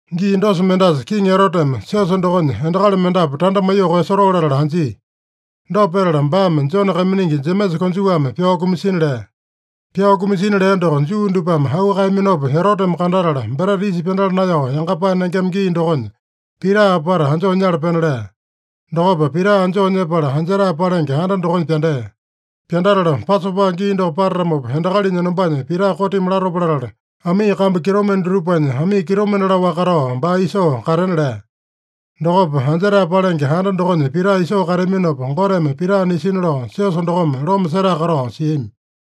Gii dosa mendasa Kiŋi Eroteme siosa dokonya endakali mendapu tanda maiyoo koeyasotoo latala anjia. Dopa petala baame Jone kaiminingi Jemesa konjuwame pyao kumasina lea. Pyao kumasina lea doko Juu dupame auu kaeyaminopa Eroteme kandatala, Breta Yisa Pyandala Naeyao Yangapae Nengema gii dokonya, Pita apata anjoo nyala pena lea. Dokopa Pita anjoo nyepala, anjetae palenge anda dokonya pyandea. Pyandatala, Pasopa gii doko patatamopa, endakalinya enombanya Pita kotimi latopa latala, amii kambu kitomende dutupanya, amii kitomende laowaka katao baa isoo katena lea. Dokopa anjetae palenge anda dokonya Pita isoo kateaminopa, Goteme Pita nisina lao siosa dokome loma setae katao siami.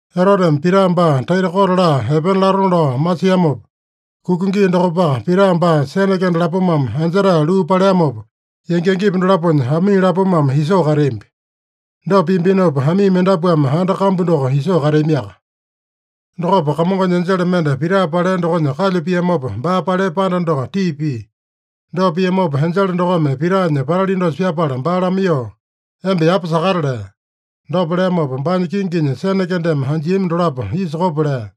Eroteme Pita baa taita kote laa epena latona lao masiamopa, kuka gii dokopaka, Pita baa sene kende lapomame anjetae luu paleamopa, yangi-yangipa dolaponya amii lapomame isoo kateambi. Dopa piambinopa, amii mendapuame anda kambu doko isoo kateamiaka. Dokopa Kamongonya enjele mende Pita palea dokonya kalyu piamopa, baa palea panda doko tii pia. Dopa piamopa, enjele dokome Pitanya patali dosa pyapala baa lamaiyoo, “Emba yapa sakata” lea. Dopa leamopa, baanya kinginya sene kendeme anjiami dolapo isa kopo lea.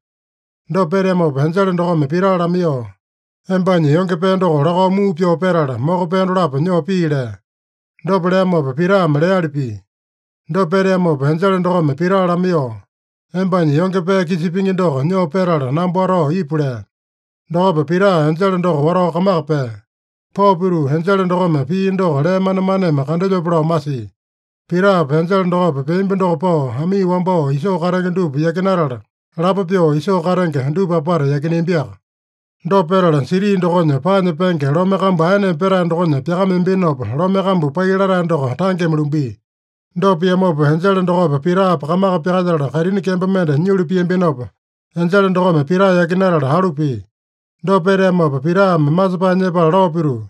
Dopa peteamopa enjele dokome Pita lamaiyoo, “Embanya yonge pee doko lakao muu pyoo petala, moko pee dolapo nyoo pii” lea. Dopa leamopa Pitame leali pia. Dopa peteamopa enjele dokome Pita lamaiyoo, “Embanya yonge pee kisa pingi doko nyoo petala, namba watao ipu” lea. Dokopa Pita enjele doko watao kamaka pea. Pao pituu, enjele dokome pia doko lee manemaneme kandelyope lao masia. Pitapa enjele dokopa peambi doko pao, amii wambao isoo katenge dupa yakinatala, lapo pyoo isoo katenge dupa apata yakineambiaka. Dopa petala siti dokonya paanya penge lome kambu aeneme petae dokonya pyakameambinopa, lome kambu pai latae doko tangeme lumbia. Dopa piamopa, enjele dokopa Pitapa kamaka pyakalyetala, kaitini kembo mende nyulu piambinopa, enjele dokome Pita yakinatala alu pia. Dopa peteamopa, Pitame masepae nyepala lao pituu,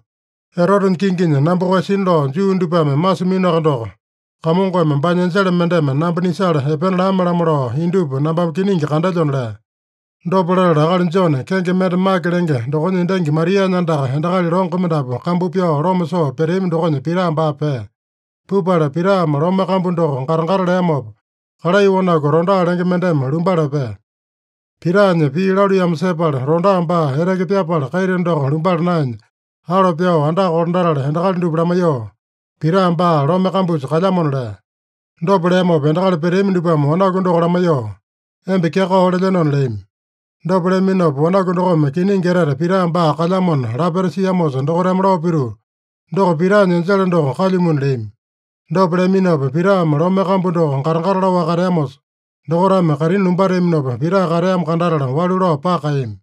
“Erotenya kinginya namba koeyasina lao Juu dupame masiminoaka doko, Kamongome baanya enjele mendeme namba nisala epena lame-lamo lao indupa nambame kiningi kandelyona” lea. Dopa latala akali Jone, kenge mende Make lenge dokonya endangi Marianya andaka endakali longo mendapu kambu pyao loma soo peteami dokonya Pita baa pea. Pupala Pitame lome kambu doko gata-gata leamopa, kalai wanaku Roda lenge mendeme lumbala epea. Pitanya pii laluiyamo sepala, Roda baa eteke pyapala kaita doko lumbala naenya, alo pyao andaka kolandatala endakali dupa lamaiyoo, “Pita baa lome kambusa kalyamona” lea. Dopa leamopa endakali peteami dupame wanaku doko lamaiyoo, “Emba kyakao lelyenona” leami. Dopa leaminopa, wanaku dokome kiningi etete Pita baa kalyamona lapeta siamosa dokaitame lao pituu, “Doko Pitanya enjele doko kalyumuna” leami. Dopa leaminopa, Pitame lome kambu doko gata-gata laowaka kateamosa, dokaitame kaitini lumbateaminopa, Pita kateamo kandatala walu lao paka kaeyami.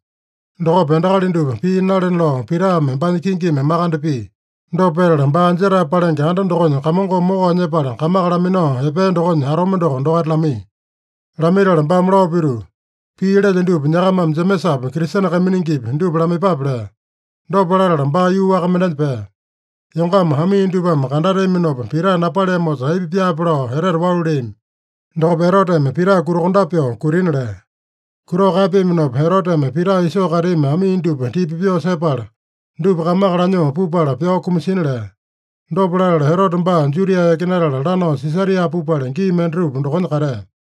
Dokopa endakali dupa pii nalena lao Pitame baanya kingimi makande pia. Dopa petala, baa anjetae palenge anda dokonya Kamongome mokao nyepala, kamaka laminao epea dokonya atome doko dokaita lamaiya. Lamaitala baame lao pituu, “Pii lelyo dupa nyakamame Jemesapi, Kristene kaiminingipi, dupa lamaiyepape” lea. Dopa latala baa yuu waka mendenya pea. Yongama amii dupame kandateaminopa Pita napaleamosa, aipa pyaape lao etete walu leami. Dokopa Eroteme Pita kutakondape pyoo kutina lea. Kutao kaepeaminopa, Eroteme Pita isoo kateami amii dupa tipa pyoo sepala, dupa kamaka lanyoo pupala pyao kumasina lea. Dopa latala, Erote baa Judia yakinatala, lanao Sisaria pupala, gii mendatupa dokonya katea.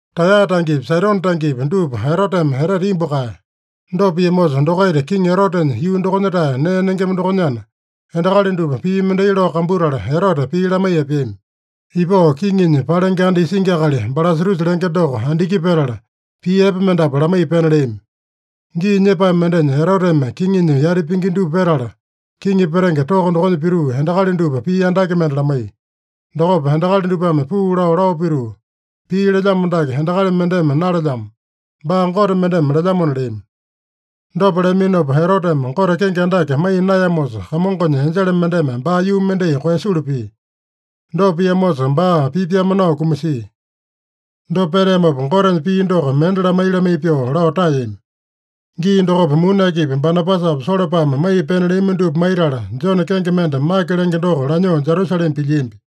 Taeya tangepi, Saidone tangepi, dupa Eroteme etete imbu kaeya. Dopa piamosa, dokaita Kiŋi Erotenya yuu dokonya-tae nee nengema dokonyana, endakali dupa pii mendai lao kambutala Erote pii lamaiya epeami. Ipao kiŋinya palenge anda isingi akali Balasatusa lenge doko andiki petala, pii epe mendapu lamaiya pena leami. Gii nyepae mendenya Eroteme kiŋinya yati pingi dupa petala, kiŋi petenge toko dokonya pituu, endakali dupa pii andake mende lamaiya. Dokopa endakali dupame puu lao, lao pituu, “Pii lelyamo dake endakali mendeme nalelyamo. Baa gote mendeme lelyamona” leami. Dopa leaminopa, Eroteme Gote kenge andake maiya naeyamosa, Kamongonya enjele mendeme baa yuu mendai koeyasulu pia. Dopa piamosa, baa pipyame nao kumasia. Dopa peteamopa, Gotenya pii doko mende lamai-lamai pyoo lao taeyami. Gii dokopa muni akipi Banabasapa Solopame maiya pena leami dupa maitala, Jone kenge mende Make lenge doko lanyoo Jerusalema pilyiambi.